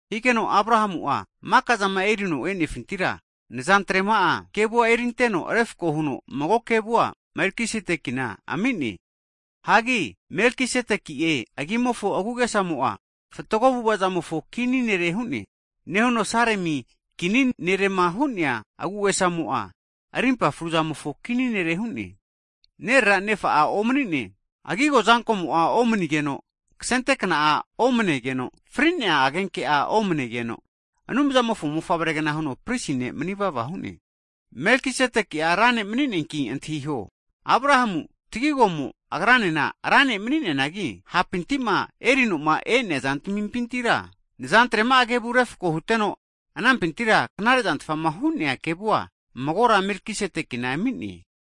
Higeno Abrahamu'a maka'zama erino e'nefintira, nazantrema'a kevu erinteno, refako huno mago kevua Melkisedekina ami'ne. Hagi Melkisedeki'e agimofo agu'agesamo'a, fatgo avu'avazamofo kini nere hu'ne. Nehuno Salemi kini nerema hu'nea agu'agesamo'a, rimpa fruzamofo kini nere hu'ne. Nerera'ene nefakea omanina'e, agigo azankomo'a omanigeno, kasente kna'a omanegeno, fri'nea agenke'a omanegeno, Anumzamofo mofavregna huno pristi ne' mani vava hu'ne. Melkisedeki'a ra ne' mani'neanki antahiho. Abrahamu'a tagigomo agranena ra ne' mani'neanagi, hapintima eri'noma e'nea zantamipintira nazantrema'a kevu refko huteno, anampintira knare'zantfama hu'nea kevua magora Melkisedekina ami'ne.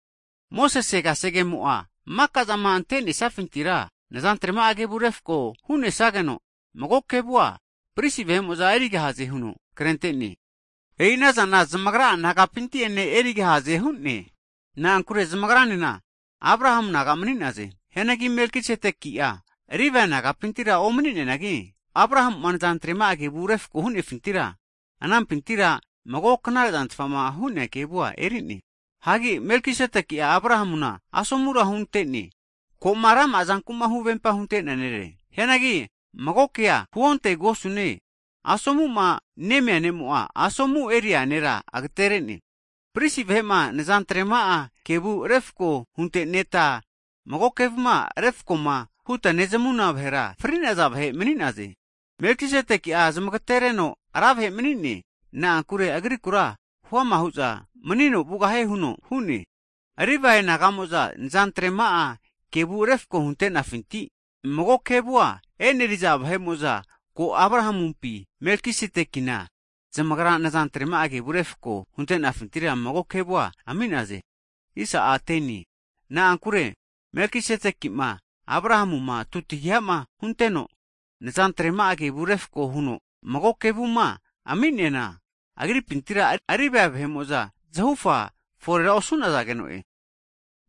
Mosese kasegemo'a maka'zama antenesafintira 10ni'a nazantrema'a kevu refko hu'nesageno, mago kevua pristi vahe'mo'za erigahaze huno krente'ne. E'i anazana zamagra'a nagapinti'ene erigahaze hu'ne. Na'ankure zamagranena Abrahamu naga mani'naze. Hianagi Melkisedeki'a Livae nagapintira omani'neanagi Abrahamu'ma nazantrema'a kevu refko hutenefintira, anampintira mago knare'zantfama hu'nea kevua eri'ne. Hagi Melkisedekia Abrahamuna asomura hunte'ne, ko'ma rama'azankuma huvempama hunte'nea nere. Hianagi mago kea huontegosune, asomuma nemia ne'mo'a asomu eneria nera agaterene. Pristi vahe'ma nazantrema'a kevu refko hunteneta mago kevuma refakoma huta nezamuna vahe'mo'za fri vagare'naze. Melkisedekia zamagatereno ra vahe mani'ne, na'ankure agrikura huama hu'za manino vugahie huno hu'ne. Livae naga'mo'za nazantrema'a kevu refko hunte'nafinti mago kevua eneriza vahe'mo'za ko Abrahamupi Melkisedekina zamagra nazantrema'a kevu refko huntenafintira mago kevua ami'naze. Na'ankure Melkisedekima Abrahamuma tutagihama hunteno, nazantrema'a kevu refko huno mago kevuma ami'neana, agripintira Livae vahe'mo'za zahufa forera osu'nazegeno'e. Hagi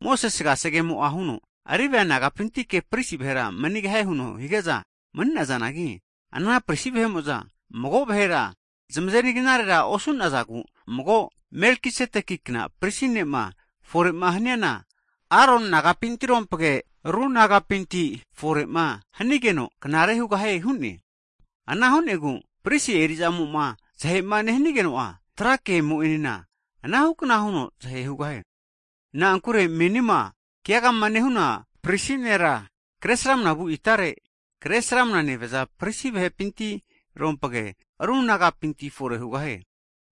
Mosese kasegemo'a huno, Livae nagapintike pristi vahera manigahie huno hige'za mani'nazanagi, ana pristi vahe'mo'za mago vahera zamazeri knarera osu'nazagu mago Melkisedekikna pristi ne'ma fore'ma haniana, Aron nagapinti rompage, ru nagapinti fore'ma hanigeno knarera hugahie hu'ne. Ana hu'negu pristi eri'zamoma zahema nehanageno'a, tra ke mo'enena anahukna huno zahe hugahie. Na'ankure menima keagama nehuna pristi nera, kre sramanavu itare, Kresramana nevaza pristi vahepinti rompage ru nagapinti fore hugahie. Hagi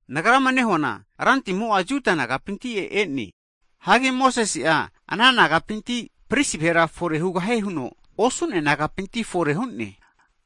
nagrama nehuana Rantimo'a Jiu nagapinti e'ne. Hagi Mosese'a ana nagapinti pristi vahera fore hugahie huno osu'nea nagapinti fore hu'ne.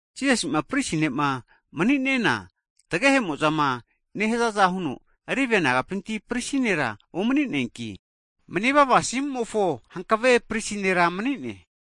Jisasi'ma pristi ne'ma mani'nena tagehe'mo'zama nehazaza huno Livae nagapinti pristi nera omani'neanki, manivava asimumofo hankave pristi ne' mani'ne.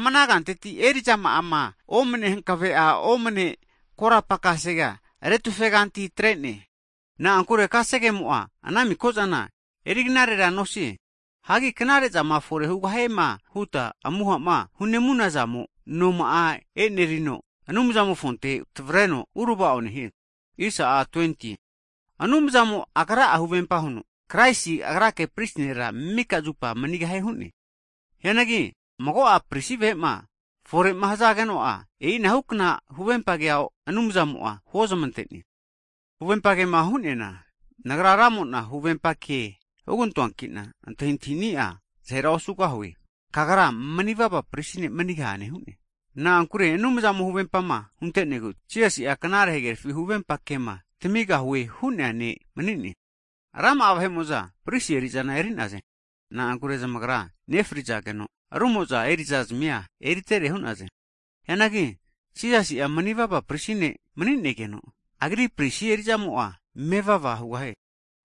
Ama ana kanteti eri'zama'ama omane hankave'a omane korapa kasegea retufeganti atrene. Na'ankure kasegemo'a ana mikozana eriknarera nosie. Hianagi knare'zama fore hugahiema huta amuhama hunemunazamo noma'a e'nerino Anumzamofonte tavreno urava'o nehie. Hagi Anumzamo'a Agra'a huvempa huno, Kraisi Agrake pristi nera mika zupa manigahie hu'ne. Hianagi mago'a pristi vahe'ma fore'ma hazageno'a, e'inahukna huvempa kea Anumzamo'a huozmante'ne. Huvempa kema hu'neana, Nagra Ramo'na, huvempa ke hugantoankina antahintahini'a zahera osugahue. Kagra manivava pristi ne' manigahane hu'ne. Na'ankure Anumzamo huvempama hunte'negu, Jisasi'a knare hagerafi huvempa kema tamigahue hu'nea Ne' mani'ne. Rama'a vahe'mo'za pristi eri'zana eri'naze, na'ankure zamagra nefrizageno, rumo'za eri'zazmia eritere hu'naze. Hianagi Jisasi'a manivava pristi ne' mani'nigeno, Agri pristi eri'zamo'a mevava hugahie.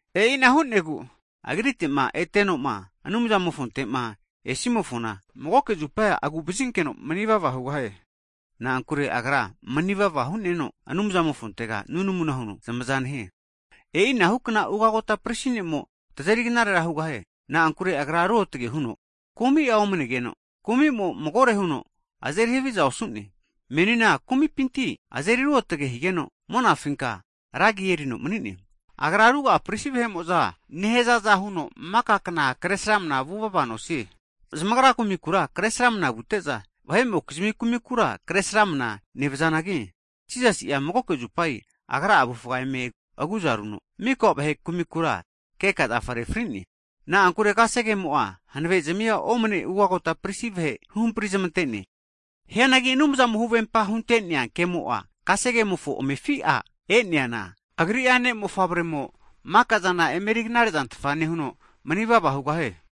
E'ina hu'negu Agrite'ma etenoma, Anumzamofontema esimofona magoke zupa agu'vazinkeno mani vava hugahie. Na'ankure Agra manivava hu'neno, Anumzamofontega nunamu huno zamaza nehie. E'inahukna ugagota pristi ne'mo tazeri knarera hugahie. Na'ankure Agra ruotge huno kumi'a omanegeno kumi'mo magore huno azeri haviza osu'ne. Menina kumi vahepinti azeri ruotge higeno, monafinka ragi erino mani'ne. Agra ruga'a pristi vahe'mo'zama nehazaza huno mika kna kresrama vuvava nosie. Zamagra kumikura kresramana vute'za, vahe'mokizmi kumikura kresramana nevazanagi, Jisasi'a magoke zupa Agra avufga eme aguza runo, maka vahe kumikura keka zafarera fri'ne. Na'ankure kasegemo'a hanavezami omane ugagota pristi vahe huhamprizmante. Hianagi Anumzamo'a huvempa hunte'nea kemo'a kasegemofo amefi'a e'neana, Agri'a Ne'mofavremo mikazana emeri knare'zantfa nehuno manivava hugahie.